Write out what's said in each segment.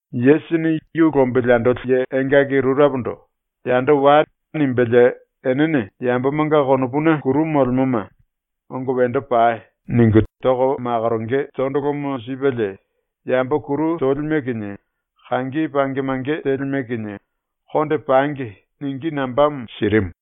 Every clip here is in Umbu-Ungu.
Yesusini yu lombili andoli ye engaki rurepondo “Yando wai.” nimbelie enene yambomanga konopuna kuru molemoma “Ongo wendo pai.” ningu toko makoronge tondolomo sipelie, yambo kuru tolime kinie kangi pange mange telime kinie ‘Konde pangi.’ ningí nambamo sirimu.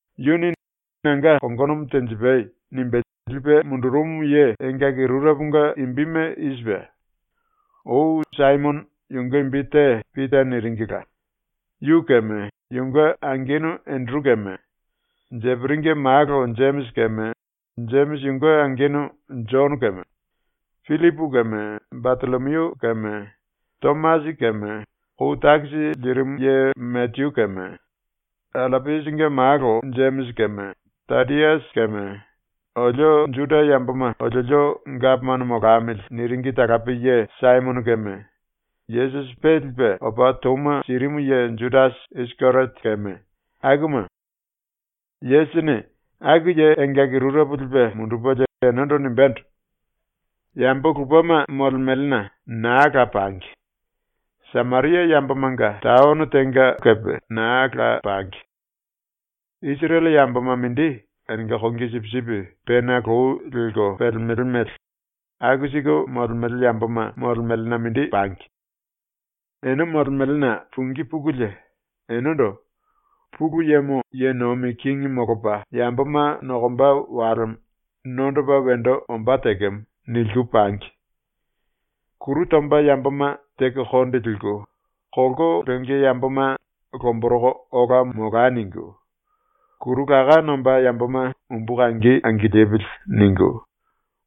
Yuni “Nanga kongonomo tenjipai.” nimbe lipe mundurumu ye engaki rureponga imbime i sipe: Ou Saimono, yunge imbi te ‘Pita’ niringila, yu keme yunge angenu Enderu keme, Jeperinge malo Jemisi keme Jemisi yunge angenu Jono keme, Pillipu keme Batollomiu keme, Tomasi keme kou takisi lirimu ye Mateyu keme, Allapiasinge malo Jemisi keme Tadiasi keme, “Olio Juda yamboma oliolio gapomano molamili.” niringi talape ye Saimono keme Yesusi pe lipe opa touma sirimu ye Judasi Isikeriote keme, akuma. Yesusini aku ye engaki rurepo lipe mundupelie enendo nimbendo: “Yambo lupema molemelena naa la pangi. Sameria yambomanga taono tenga naa la pangi. Isirele yamboma mindi enenga kongi sipisipi pena lou lelko pelemele mele aku siku molemele yamboma molemelena mindi pangi. Ene molemelena pungí pukulie, enendo “Pulu Yemo ye nomi kingi molopa yamboma nokomba walemo nondopa wendo ombá tekemo.” niliku pangi. “Kuru tomba yamboma teko konde liku, kolko lenge yamboma ‘Lomboroko ola molai.’ ningu, kuru laká nombá yamboma ‘Umbu kangi angilipili.’ ningu,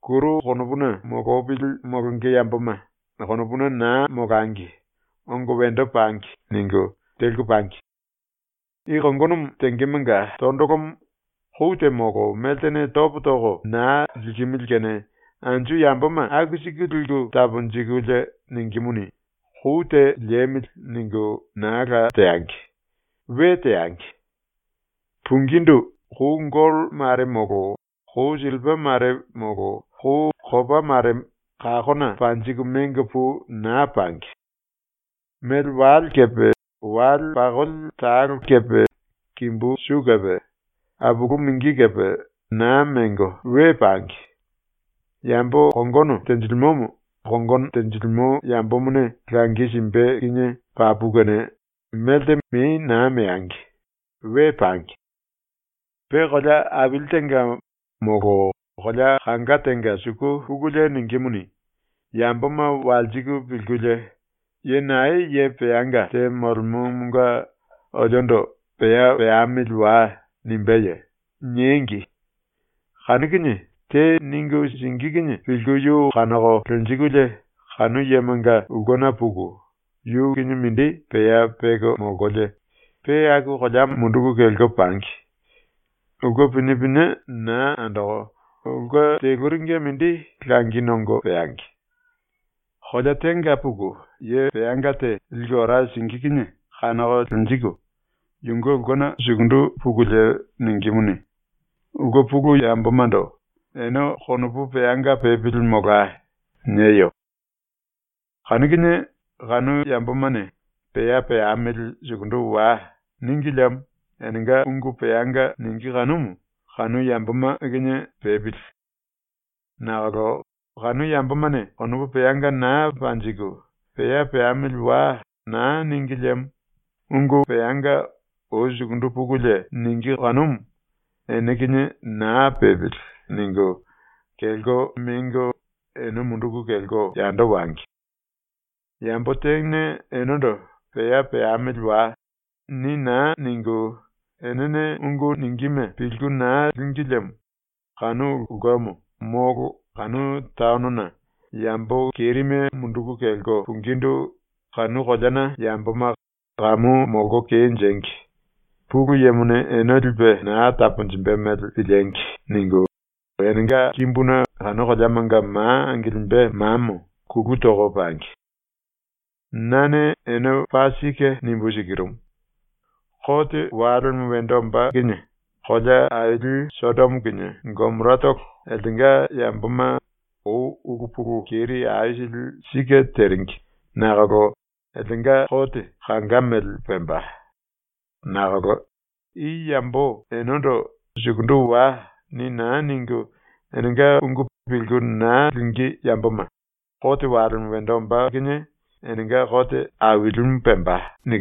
kuru konopuna molopili molonge yamboma ‘Konopuna naa molangi, ongo wendo pangi.’ ningu teliku pangi. I kongonomo tengemonga tondolomo kou te molo meltene topo toko naa likimili kene anju yamboma aku siku liku taponjikulie ningímuni, ‘Kou te liemili.’ ningu naa la teangi. We teangi. “Pungindu kou gollo mare molo kou sillipa mare molo kou kopa mare kakona panjiku mengo pu naa pangi. Mele wale kepe wale pakoli talo kepe kimbu su kepe apulu mingi kepe naa mengo we pangi. Yambo kongono tenjilimomo kongono tenjilimo yambomone langi simbe kinie papu kene melte mei naa meangi. We pangi. “Pe kolea aili tenga molo kolea kanga tenga suku pukulie ningímuni, yamboma walsiku pilkulie “Ye nae ye peanga te molemomonga oliondo “Pea peamili wai.” nimbeye?” niengi. Kanu kinie te ningu singí kinie pilku yu kanoko lenjikulie kanu yemonga ulkena puku yu kinie mindi pea peko molkolie pe aku koleamo munduku kelko pangi. ⸤Ulke pinie pinie na andoko ulke teluringe mindi langi nongo peangi.⸥ ⸤Kolea tenga puku ye peanga te liku ora singí kinie kanoko lenjiku⸥ yunge ulkena sukundu pukulie ningímuni, ulke pulu yambomando “Ene konopu peanga pepili molai.” nieyo. Kanu kinie kanu yambomane “Pea peamili sukundu wai.” níngi liemo, enenga ungu peanga ningí kanumu kanu yamboma kinie pepili. Nakolo kanu yambomane konopu peanga naa panjiku, “Pea peamili wai.” na níngi liemo ungu peanga ou sukundu pukulie ningí kanumu “Ene kinie naa pepili.” ningu, kelko mengo ⸤ene munduku kelko yando wangi⸥. “Yambo tene enendo “Pea peamili wai.” ni naa ningu enene ungu ningíme pilku naa língi liemo kanu ulkemo molo kanu taonona yambo kerime munduku kelko pungindu ⸤kanu koleana yamboma ‘Kamu molko kenjengi! Pulu Yemone ene lipe naa taponjimbe mele piliengi.’ ningu⸥ enenga kimbuna kanu koleamanga ma angilimbe mamo kulu toko pangi. Nane ene paa sike nimbu sikirumu: Kote walemo wendo ombá kinie kolea aili Sodomo kinie Gomoratolo eltenga yamboma ⸤ou ulu pulu keri aisili sike teringi nakolo⸥ eltenga kote kanga mele pemba. Nakolo i yambo enendo “Sukundu wai.” ni naa ningu enenga ungu pilku na lingí yamboma kote walemo wendo ombá kinie enenga kote ailimu pemba.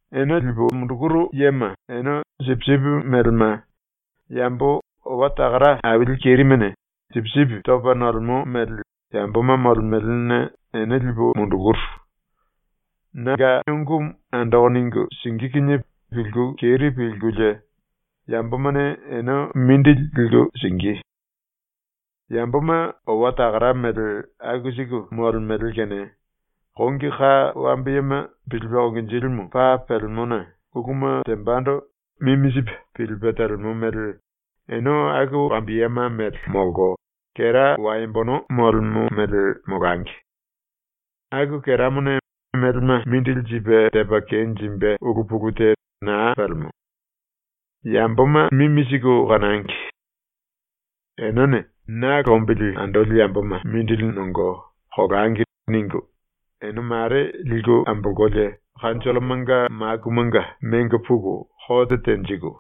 “Ene lipu mundukuru yema ene sipisipi melema, yambo owa takara aili kerimene sipisipi topa nolemo mele yamboma molemelena ene lipu mundukuru. ⸤Nanga ungumu andoko ningu singí kinie pilku keri pilkulie yambomane ene mindili liku singí.⸥ Yamboma owa takara mele aku siku molemele kene kongi ka wambiyema pilipe konginjilimu paa pelemona uluma tembando mimi sipe pilipe telemo mele ene aku wambiyema mele molko, kera waembono molemo mele molangi. ⸤Aku keramone melema mindili sipe tepa kenjimbe ulu pulu te naa pelemo.⸥ “Yamboma mimi siku kanangi. Enene ⸤‘Na lombili andoli yamboma mindili nongo, kolangi.’ ningu,⸥ ene ⸤mare liku ambolkolie⸥ kanjollomanga makumanga mengo puku kote tenjiku,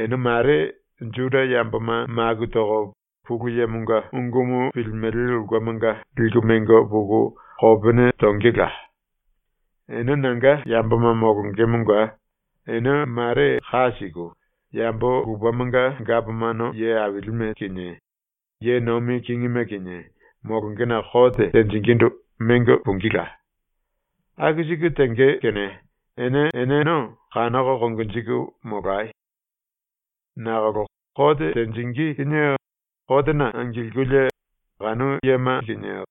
ene ⸤mare⸥ Juda yamboma maku toko Pulu Yemonga ungumu pilimele ulkemanga liku mengo puku kopene tongela. Ene nanga yamboma molongemonga ene ⸤mare ka siku⸥ yambo lupemanga gapomano ye ailime kinie ye nomi kingime kinie molongena ⸤kote tenjingindu⸥ mengo pungíla. Aku siku tenge kene ene eneno kanoko konjiku molayo. Nakolo kote tenjingí kinie kotena angilkulie kanu yema kinie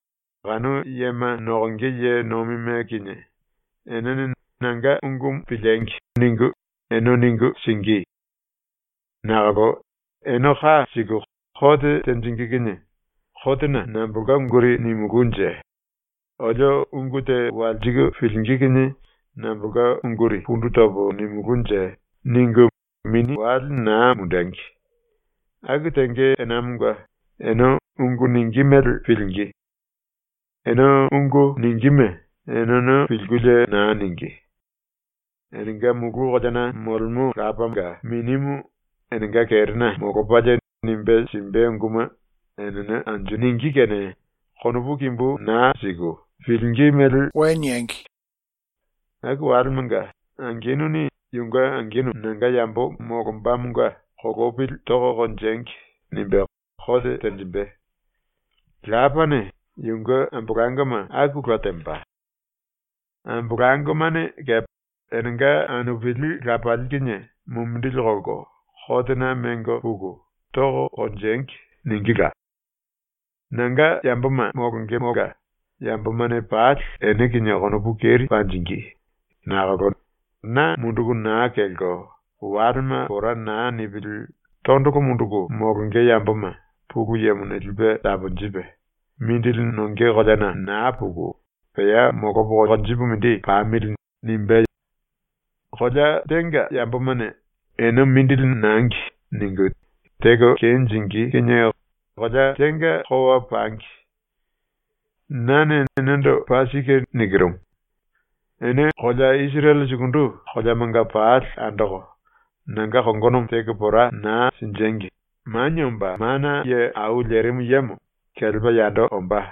kanu yema nokonge ye nomime kinie enene ‘Nanga ungumu piliengi!’ ningu ene ningu singí. Nakolo ene ka siku kote tenjingí kinie ‘Kotena nambolka unguri nimulúnje? Olio ungu te walsiku pilingí kinie nambolka unguri pundu topo nimulúnje?’ ningu mini wale naa mundengi. Aku tenge enamonga ene ungu ningí mele pilingí. Ene ungu ningíme eneno pilkulie naa ningí. Enenga ⸤mulu koleana molemo⸥ Lapanga Minimu enenga kerena molopalie nimbe simbe unguma enene anju ningí kene konopu kimbu naa siku, pilingí mele niengi. “⸤Aku walemanga⸥ angenuni yunge angenu ⸤nanga yambo molombamonga⸥ ‘Kolopili toko konjengi.’ nimbe kote tenjimbe. Lapane yunge ambolangoma akula temba. Ambolangomane kepe enenga anupili lapali kinie mumindili kolko kotena mengo puku “Toko konjengi.” ningíla. Nanga yamboma molongemonga yambomane pali ene kinie konopu keri panjingí, nakolo na munduku naa kelko walema pora naa nipili tondolo munduku molonge yamboma ⸤Pulu Yemone⸥ lipe taponjipe ‘Mindili nonge koleana naa puku pea molopo konjipu mindi pamili.’ nimbé. Kolea tenga yambomane ‘ene mindili nangi.’ ningu teko kenjingí kinie kolea tenga kowa pangi. Nane enendo paa sike nikirumu: Ene kolea Isirele sukundu koleamanga pali andoko nanga kongonomo teko pora naa sinjengi Manie Omba Mana Ye Au Lerimu Yemo ⸤kelepa yando⸥ ombá.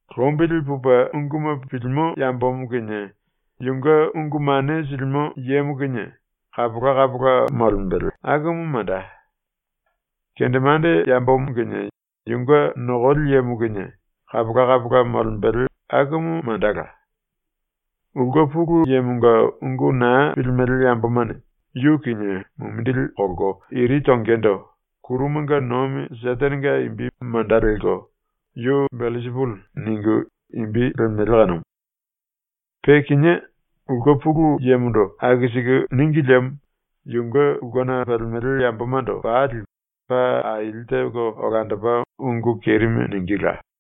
Lombili pupe unguma pilimo yambomo kinie yunge ungu mane silimo yemo kinie kapola kapola molembele akumu manda. Kendemande yambomo kinie yunge nokoli yemo kinie kapola kapola molembele akumu mandala. Ulke pulu yemonga ungu na pilimele yambomane yu kinie mumindili kolko iri tongendo ⸤kurumanga nomi Setenenga imbi manda lelko⸥ “Yu Belsipuli” ningu imbi lemele kanumu. Pe kinié ulke pulu yemondo aku siku níngi liemo yunge ulkena pelemele yambomando pali paa aili teko olandopa ungu kerime ningíla.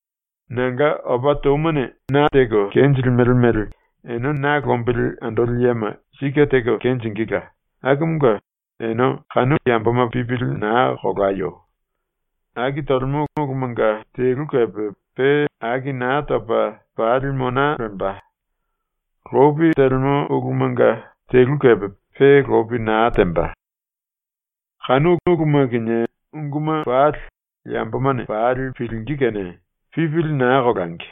“⸤Nanga opa toumane na teko kenjilimele mele ene na lombili andoli yema sike teko kenjingíla⸥ akumunge ene kanu yamboma pipili naa kolayo. Aki tolemo ulumanga telu kepe pe aki naa topa pali mona lemba. Lopi telemo ulumanga telu kepe pe lopi naa temba. Kanu uluma kinie unguma pali yambomane pali pilingí kene pipili naa kolangi.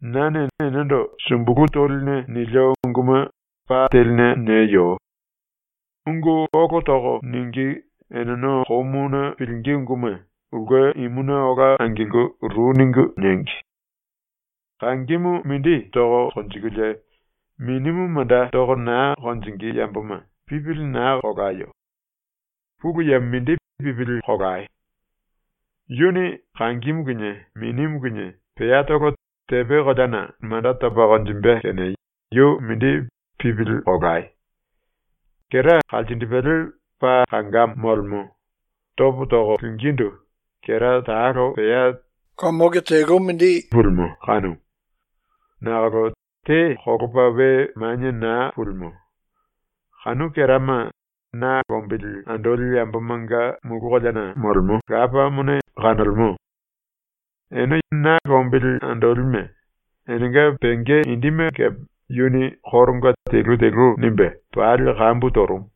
Nane enendo sumbulu toline nilio unguma pa teline nieyo. Ungu ólo toko ningí eneno komuna pilingí unguma ulke imuna ola angilku ru ningu niengi. “Kangimu mindi toko konjikulie minimu manda toko naa konjingí yamboma pipili naa kolayo. ⸤Pulu Yemo mindi pipili kolayo⸥. Yuni kangimu kinie minimu kinie peatolo tepe koleana manda topa konjimbe kene yu mindi pipili kolai. “Kera kalsindipele paa kangamo molemo, topo toko lingíndu kera talo pea tene toya mele mindi pulimo kanumu. Nakolo te kolopa we manie naa pulimo. Kanu kerama na lombili andoli yambomanga ⸤mulu koleana molemo⸥ Lapamone kanolemo. Ene ⸤na lombili andolime⸥, enenga penge indime kepe yuni koronga telu telu nimbe pali kambu torumu.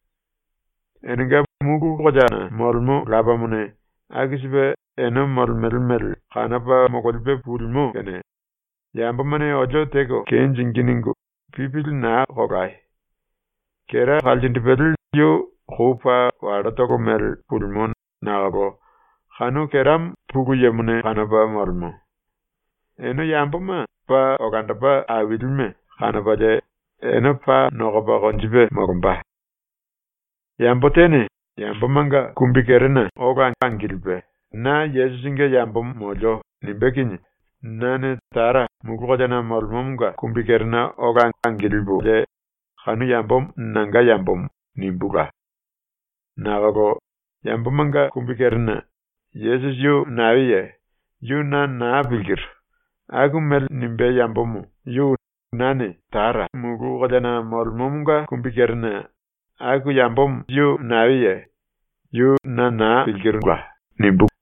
Enenga ⸤mulu koleana molemo⸥ Lapamone aku sipe ene molemele mele kanopa mololipe pulimo kene ⸤‘Yambomane olio teko kenjingí.’ ningu⸥ pipili naa kolayo. Kera kalsindipele yu kou paa wallotolo mele pulimo nakolo kanu keramo Pulu Yemone kanopa molemo. Ene yamboma paa olandopa ailime kanopalie ene paa nokopa konjipe molomba. “Yambo tene yambomanga kumbikerena ola angilipe “Na Yesusinge yambomo molio.” nimbé kinie nane Tara mulu koleana molemomonga kumbikerena ola angilipu “Kanu yambomo nanga yambomo.” nimbula. Nakolo yambomanga kumbikerena “Yesusi yu naeye? Yu na naa pilkiru.” aku mele nimbé yambomo yu nane Tara mulu koleana molemomonga kumbikerena “Aku yambomo yu naeye? Yu na naa pilkiru.” nimbúla.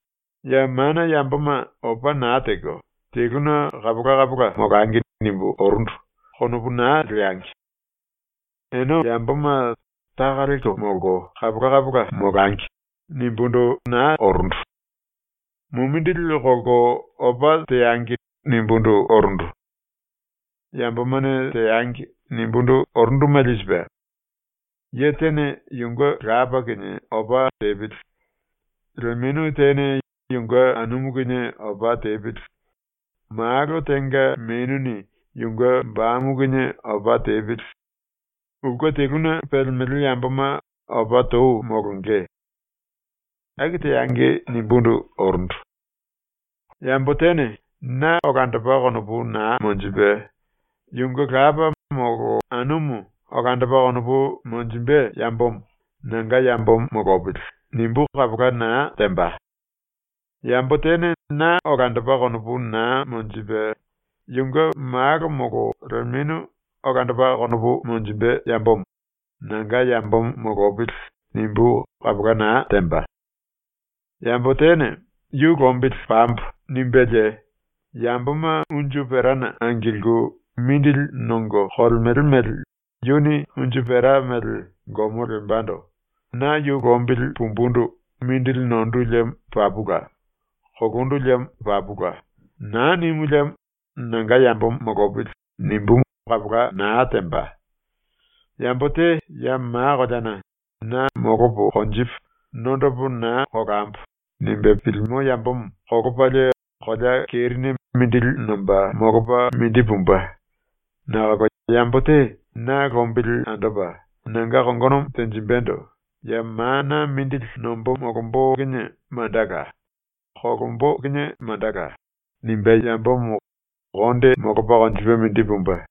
“‘ ‘Ya mana yamboma opa naa teko teluna kapola kapola molangi.’ nimbu orundu.’ konopu naa leangi. Ene yamboma ‘Taka lelko molko kapola kapola molangi.’ nimbundu naa orundu. ‘Mumindili kolko opa teangi.’ nimbundu orundu. ‘Yambomane teangi.’ nimbundu orundu mele i sipe: “Ye tene yunge lapa kinie opa tepili, lemenu tene yunge anumu kinie opa tepili, malo tenga menuni yunge bamu kinie opa tepili. Ulke teluna pelemele yamboma opa tou molonge.” ‘Aku teangi.’ nimbundu orundu. “Yambo tene na olandopa konopu naa monjipe, yunge lapa molo anumu olandopa konopu monjimbe yambomo ‘Nanga yambomo molopili.’ nimbú kapola naa temba. Yambo tene na olandopa konopu naa monjipe, yunge malo molo lemenu olandopa konopu monjimbe yambomo ‘Nanga yambomo molopili.’ nimbú kapola naa temba. Yambo tene ‘Yu lombili pambo.’ nimbelie yamboma unju perana angilku mindili nongo kolemele mele yuni unju pera mele gomo lembando ‘Na yu lombili pumbundu mindili nondu liemo papula; kolondu liemo papula.’ naa nimu liemo ‘Nanga yambomo molopili.’ nimbú kapola naa temba. Yambo te ya ma koleana ‘Na molopo konjipu, nondopo naa kolambo.’ nimbe pilimo yambomo kolopalie kolea kerine mindili nomba molopa mindi pumbe. Nakolo yambo te na lombili andopa nanga kongonomo tenjimbendo ‘Ya mana mindili nombo molombo kinie mandala, kolombo kinie mandala.’ nimbé yambomo konde molopa konjipe mindi pumbe.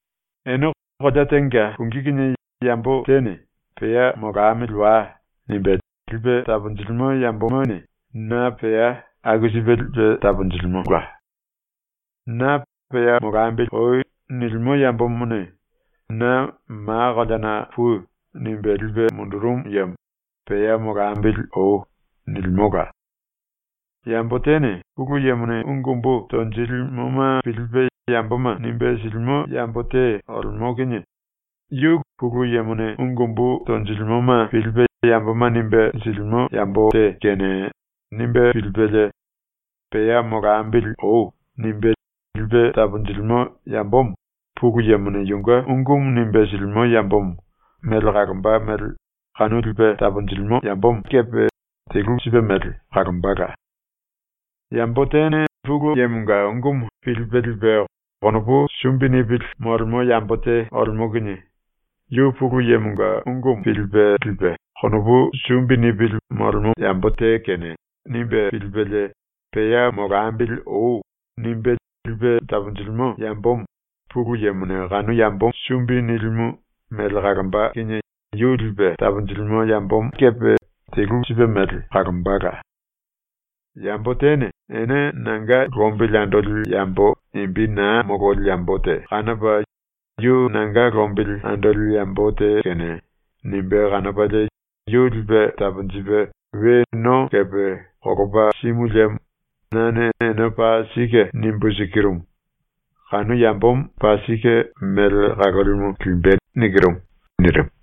“Ene kolea tenga pungí kinie yambo tene ‘Pea molamili wai.’ nimbe lipe taponjilimo yambomo na pea aku sipe lipe taponjilimo. Na ‘Pea molambili oi.’ nilimo yambomone na “Ma koleana pui.” nimbe lipe mundurumu yemo ‘Pea molambili oi.’ nilimola. Yambo tene Pulu Yemone ungu umbu tonjilimoma pilipe yamboma nimbe silimo yambo te olemo kinie ‘Yu Pulu Yemone ungu umbu tonjilimoma pilipe yamboma nimbe silimo yambo te kene’ nimbe pilipelie “Pea molambili oi.” nimbe lipe taponjilimo yambomo Pulu Yemone yunge ungumu nimbe silimo yambomo mele kalomba mele kanu lipe taponjilimo yambomo kepe telu sipe mele kalombala. Yambo tene Pulu Yemonga ungumu pilipe lipe konopu sumbi nipili molemo yambo te olemo kinie ‘Yu Pulu Yemonga ungumu pilipe lipe konopu sumbi nipili molemo yambo te kene.’ nimbe pilipelie ‘Pea molambili oi.’ nimbe lipe taponjilimo yambomo ⸤Pulu Yemone⸥ kanu yambo sumbi nilimu mele kalomba kinie yu lipe taponjilimo yambomo kepe telu sipe mele kalombala. Yambo tene ene nanga lombili andoli yambo imbi naa mololi yambo te kanopa ‘yu nanga lombili andoli yambo te kene’ nimbe kanopalie yu lipe taponjipe we no kepe kolopa simu liemo nane ene paa sike nimbu sikirumu, kanu yambomo paa sike mele kalolimu limbe.” nirimu.